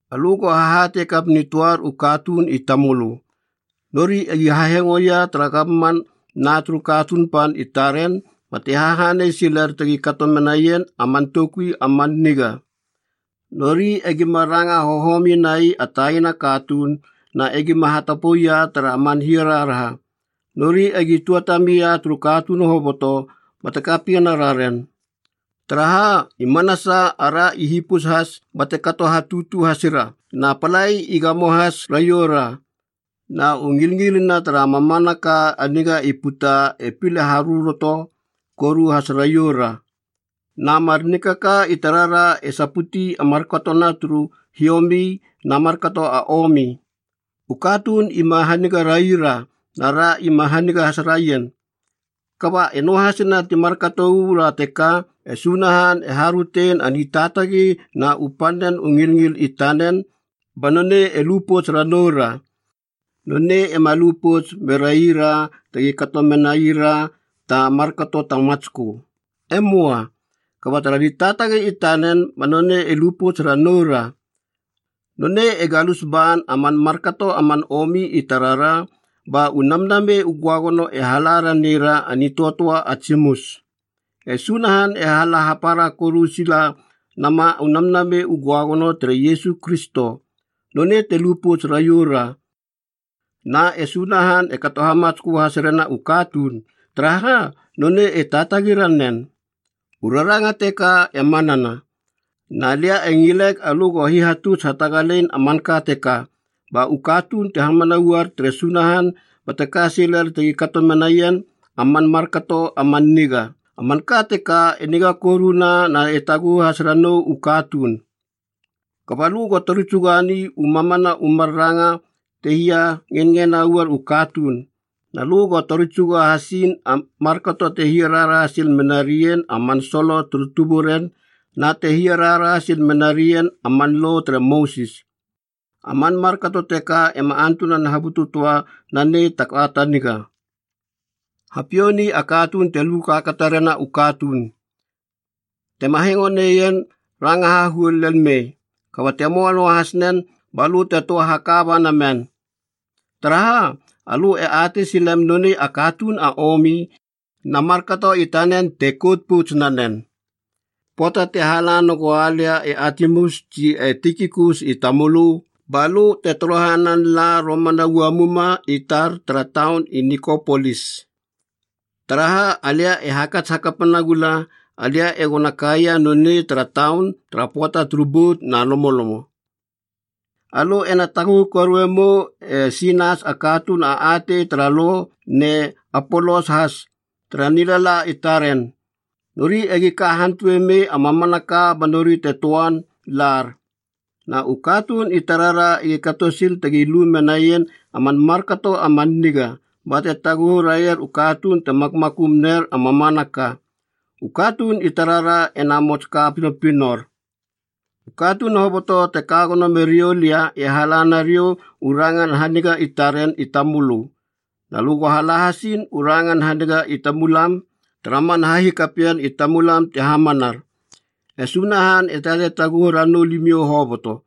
Alö go hahatei kap nitöar u katuun i tamölö, nori egi hahengoia tara gamman na turu katuun pan i taren bate hahanei siler tegi kato menaien a man toukui a man niga. Nori egima ranga hohomi nai a taina katuun na egima hatapoia tara man hiaraharaha. Nori egi tuatamia turu katuun hoboto bate kapiena raren. Taraha, i manasa ara i hipus has bate kato hatutu hasira na palai i gamo has raioura. Na u ngilngilina tara mamanaka a nigana i puta e pile haröroto koru has raioura. Na mar nikaka i tarara e saputi a markatona turu hiomi na markato a omi. U katuun ima haniga rai ra, na ra ima haniga has raien. Kaba e noahasina ti markato uu ra teka, e Sunahan e harötein a nitaatagi na u pannen u ngilngil i tanen, ba nonei e lu pouts ranou ra. Nonei ema lu pouts meraira tegi kato menaira ta markato ta matskö. E möa! Kaba tara nitaatagi i tanen ba nonei e lu pouts ranoura. Nonei e galus ban a man markato a man omi i tarara ba u Namnamei u Göagono e hala ranera a nitöatöa a tsimus. E Sunahan, e hala hapara koru sila nama u Namnamei u Göagono tere Iesu Kristo, nonei te lu pouts raioura, Na e Sunahan e kato hamatskö has rena u katuun, taraha nonei e taatagi ranen. U raranga teka e manana. Na lia e ngileg alö go hihatuts hatagalein a manka teka, ba u katuun te hamana uaier tere Sunahan bate ka siler tegi kato menaien a man markato a man niga. A manka teka e niga koruna na e taguhu has ranou u katuun. Kaba lö go tori tsugani u mamana u mar ranga te hia ngenngena uaier u katuun. Na lö go tori tsuga hasiin a markato te hia raharaha sil menarien a man solo turu tuburen na te hia raharaha sil menarien a man Lo tere Mosis. A man markato teka ema antunan habutu töa nanei ta ka ta niga. Hapiouni a katuun te lu kaakata rena u katuun. Tema hengo neien, ranga hahuol lel mei. Kaba te möa noahas nen, balö te töa haka ba namen. Taraha, alö e atei silem nonei a katuun a omi. Na markato i tanen te kout pouts nanen. Pöata te hala nagoua lia e Atimas tsi e Tikikus i tamölö, balö te torohanan la romana uamuma i tar tara taun i Nikopolis, taraha, alia e hakats hakapa nagula alia egona kaia nonei tara taun tara pöata turu bout na lomolomo. Alö ena taguhu korue mou e Sinas a katuun a atei tara Lo ne Apolos has, tara nilala i taren. Nori egi ka hantue mei a mamanaka ba nori te töan lar. Na u katuun i tarara egi kato sil tegi lu menaien a man markato a man niga, bate taguhu raier u katuun te makmakum ner a mamanaka. U katuun i tarara ena mots ka pinopinor. U katuun hoboto te kagono meriou lia e hala nariou u rangan haniga i taren i tamölö. Na lö go hala hasiin u rangan haniga i tamulam tara man hahikapien i tamulam te hamanar. E Sunahan e tatei taguhu ranou limiou hoboto.